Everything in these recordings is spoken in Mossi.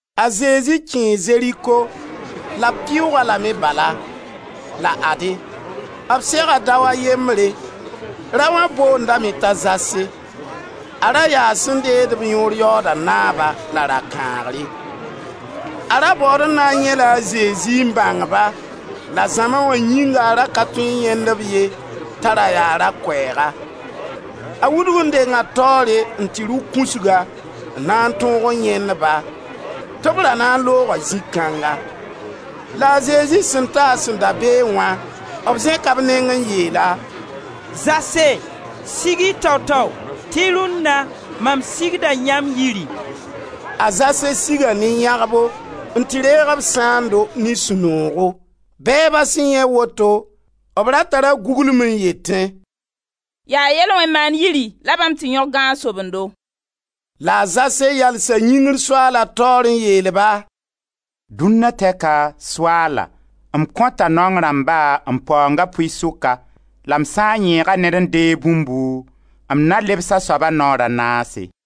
A Zezi kẽe Zeriko la b pɩʋʋg-a lame bala. La ade, b sega dao a yembre. Raoã boondame t'a Zase. A ra yaa sẽn deesd-b yõor yaooda naaba la rakãagre. A ra baood n na n yãe-la a Zezi n bãng-ba la zãma wã yĩnga a ra ka tõe n yãend-b ye t'a ra yaa ra-koɛɛga. A wudg n denga taoore n tɩ rʋ kũsga, n na n tõog n yãend-ba, tɩ b ra na n looga zĩ kãnga. La a Zezi sẽn ta a sẽn da beẽ wã, b zẽka b neng n yeel-a: «Zase! Sig-y tao-tao tɩ rũnna mam sigda yãmb yiri.» A Zase siga ne yãgbo n tɩ reeg b sãando ne sũ-noogo. Bɛɛba sẽn yãe woto, b ra tara guglungu n yetẽ: «Yaa yel-wẽn-maand yiri la bãmb tɩ yõg gãag-sobendo.» La a Zase yalsa yĩngr Soaala taoor n yeel-ba: «Dũnna tɛka, Soaala, m kõta naong rãmba m paoonga pʋɩ-sʋka la m sã n yẽega ned n deeg bũmbu, m na lebs a soaba naoor a naase.»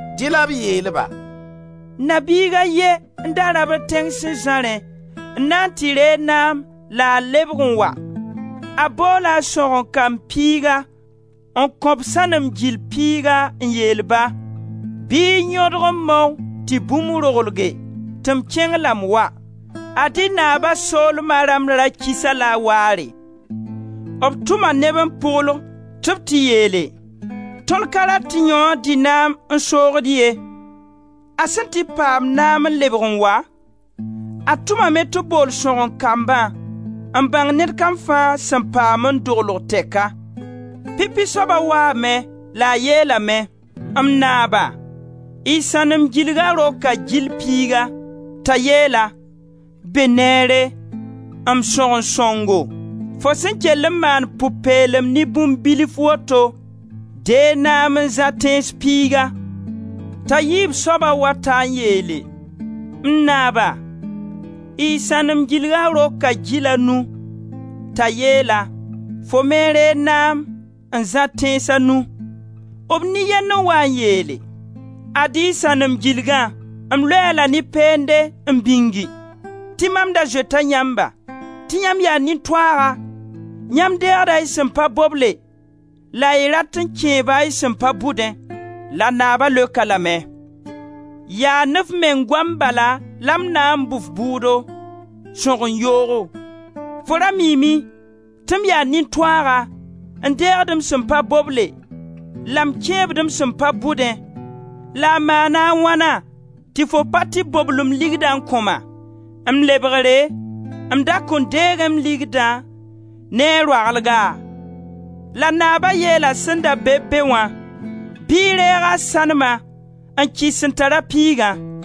Dẽ la b yeel-ba: «Na-biig a ye n da rabd tẽng sẽn zãrẽ n na n tɩ reeg naam la a lebg n wa. A boola a sõgen-kamb piiga n kõ-b sãnem gil piiga n yeel ba: ‹Bɩ y yõdg n mao tɩ bũmb roglge, tɩ m kẽng la m wa.› Ad-y naaba soolma rãmb ra kis-a-la waare. B tʋma neb n pʋgl, tɩ b tɩ yeele: ‹Tõnd ka rat tɩ yãoo dɩ naam n soogd-d ye.› A sẽn tɩ paam naam n lebg n wa, a tʋmame tɩ b bool sõgen-kambã n bãng ned kam fãa sẽn paam n doglg tɛka. Pipi soaba waame, la a yeelame: ‹M naaba, y sãnem gilga roka gil piiga.› T'a yeel-a: ‹Be neere! M sõgen sõngo, fo sẽn kell n maan pʋ-peelem ne bũmb bilf woto, deeg naam n zã tẽns piiga.› T'a yiib soaba wa ta n yeele: ‹M naaba, y sãnem gilga roka gil a nu.› T'a yeel-a: ‹Fo me reeg naam n zã tẽns a nu.› B nin-yend n waa n yeele: ‹Ad-y y sãnem gilgã, m loe-a-la ne peende n bĩng; tɩ mam da zoeta yãmba; tɩ yãmb yaa nin-toaaga; yãmb deegda y sẽn pa boble, la y rat n kẽeba y sẽn pa bʋdẽ.› La naaba leok-a lame: ‹Yaa ne f meng goam bala la m na bʋ f bʋʋdo, sõgen yoogo! Fo ra miime tɩ m yaa nin-toaaga, n deegd m sẽn pa boble la m kẽebd m sẽn pa bʋdẽ, la maana a wãna tɩ fo pa tɩ bobl m ligdã n kõ-ma? M lebgre m da kõn deegẽ m ligdã ne a roaglga?› La Naaba yeela sẽn da be-b be wã: ‹Bɩ y reeg a sãnema n kɩs sẽn tara piigã.›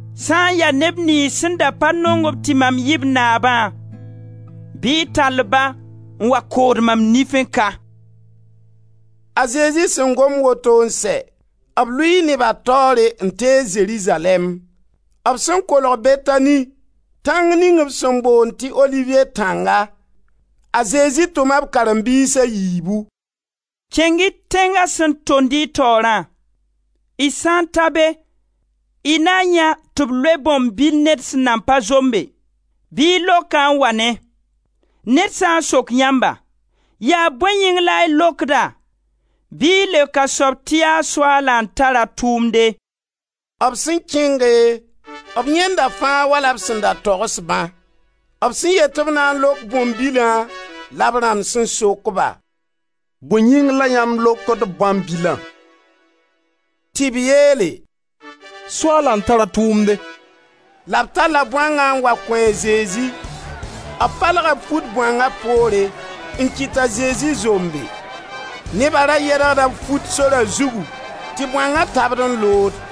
Sã n ya neb niyns sẽn da pa nong-b tɩ mam yɩ b naabã, bɩ y tall-ba n wa kood mam nifẽ ka.›» A Zezi sẽn gom woto n sɛ, b lʋɩɩ neba taoore n tees Zerizalɛɛm. B sẽn kolg Betani, tãng ning b sẽn boond tɩ Oliviye tãnga, a Zezi tʋma b karen-biis a yiibu: «Kẽng-y tẽnga sẽn tond y taoorã; y sã n ta be y na yãe tɩ b loee bõan-bil ned sẽn nan pa zombe; bɩ y lok-a n wa ne. Ned sã n sok yãmba: ‹Yaa bõe yĩng la y lokd-a› bɩ y leok a soab tɩ yaa Soaala n tar a tʋʋmde.» B sẽn kẽnge, b yãenda fãa wala b sẽn da togs-bã. B sẽn yet tɩ b na n lok bõan-bilã la b rãmb sẽn sok-ba: «Bõe yĩng la yãmb lokd bõan-bilã?» Tɩ b yeele: «Soaala n tar a tʋʋmde.» La b talla bõangã n wa kõ a Zezi. B palga b fut bõanga poore n kɩt t'a Zezi zombe. Neba ra yɛdgda b fut sora zugu tɩ bõanga tabd n lood.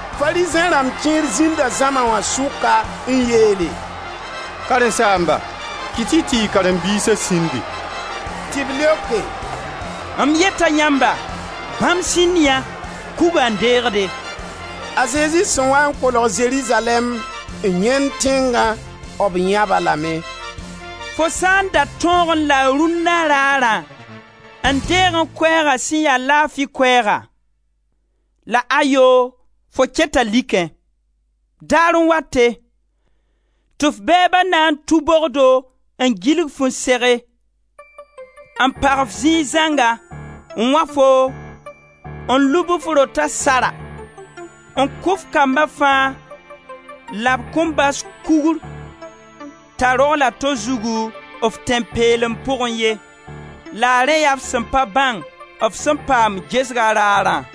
Farizẽ rãmb kẽer zĩnda zãma wã sʋka n yeele: «Karen-saamba, kɩt-y tɩ y karen-biisa sĩndi!» Tɩ b leoke: «M yeta yãmba, bãmb sĩnd yã, kugã n deegde!» A Zezi sẽn waa n kolg Zerizalɛɛm n yãend tẽngã, b yãb-a lame: «Fo sã n da tõogẽ la rũnna raarã n deegẽ koɛɛga sẽn ya laafi koɛɛgã! La ayoo fo keta likẽ. Daar n wate, tɩ f bɛɛba na n tũ bogdo n gilg-fu n sege, n pag-f zĩig zãnga, n wã foo, n lub f rota sara, n kʋ f kamba fãa la b kõn bas kugr t'a rogl a to zugu, f tẽn-peelem pugẽ ye. La rẽ yaa f sẽn pa bãng f sẽn paam gesga raarã!»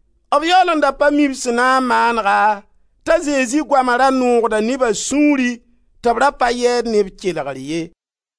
B yaool n da pa mi b sẽn na n maanega, t'a Zezi goama ra noogda neba sũuri tɩ b ra pa yɛɛd ne b kelgr ye.